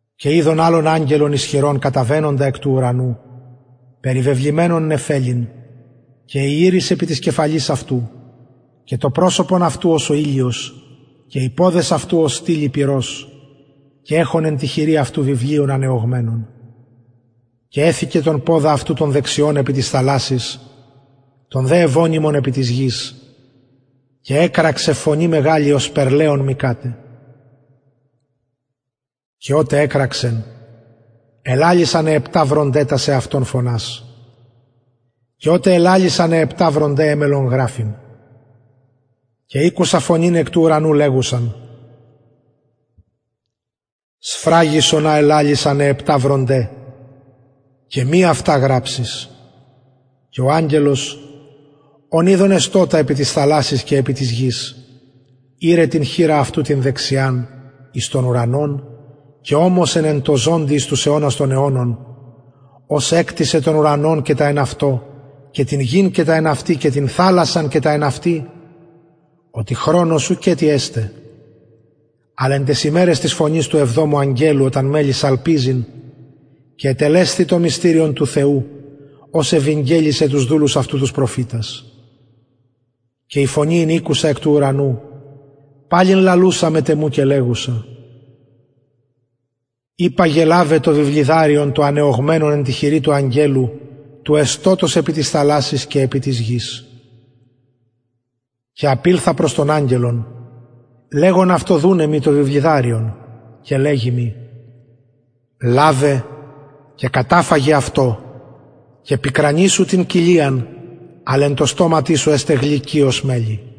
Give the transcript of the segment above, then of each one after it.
και ειδον αγγελον ισχυρον καταβαινοντα εκ του ουρανου περιβεβλημενον νεφελην και η ιρις επι της κεφαλης αυτου και το προσωπον αυτου ως ο ηλιος και οι ποδες αυτου ως στυλοι πυρος και εχων εν τη χειρι αυτου βιβλιον ανεωγμενον και εθηκεν τον ποδα αυτου τον δεξιον επι της θαλασσης τον δε ευωνυμον επι της γης και εκραξεν φωνη μεγαλη ωσπερ λεων μυκαται και οτε εκραξεν ελαλησαν αι επτα βρονται τας εαυτων φωνας και οτε ελαλησαν αι επτα βρονται εμελλον γραφειν και ηκουσα φωνην εκ του ουρανου λεγουσαν σφραγισον α ελαλησαν αι επτα βρονται και μη αυτα γραψης και ο αγγελος ον ειδον εστωτα επι της θαλασσης και επι της γης ηρεν την χειρα αυτου την δεξιαν εις τον ουρανον και ωμοσεν τω ζωντι εις τους αιωνας των αιωνων ος εκτισεν τον ουρανον και τα εν αυτω και την γην και τα εν αυτη και την θαλασσαν και τα εν αυτη οτι χρονος ουκετι εσται αλλ εν ταις ημεραις της φωνης του εβδομου αγγελου οταν μελλη σαλπιζειν και ετελεσθη το μυστηριον του θεου ως ευηγγελισεν τους δουλους αυτου τους προφητας και η φωνη ην ηκουσα εκ του ουρανου παλιν λαλουσα μετ εμου και λεγουσα υπαγε λαβε το βιβλιδαριον το ανεωγμενον εν τη χειρι του αγγελου του εστωτος επι της θαλασσης και επι της γης και απηλθον προς τον αγγελον λεγων αυτω δουναι μοι το βιβλιδαριον και λεγει μοι λαβε και καταφαγε αυτο και πικρανει σου την κοιλιαν αλλ εν τω στοματι σου εσται γλυκυ ως μελι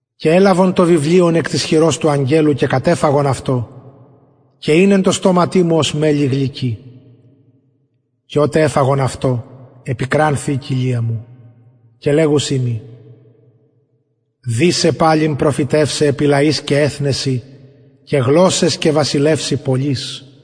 και ελαβον το βιβλιον εκ της χειρος του αγγελου και κατεφαγον αυτο και ην εν τω στοματι μου ως μελι γλυκυ και οτε εφαγον αυτο επικρανθη η κοιλια μου και λεγουσιν μοι δει σε παλιν προφητευσαι επι λαοις και επι εθνεσιν και γλωσσαις και βασιλευσιν πολλοις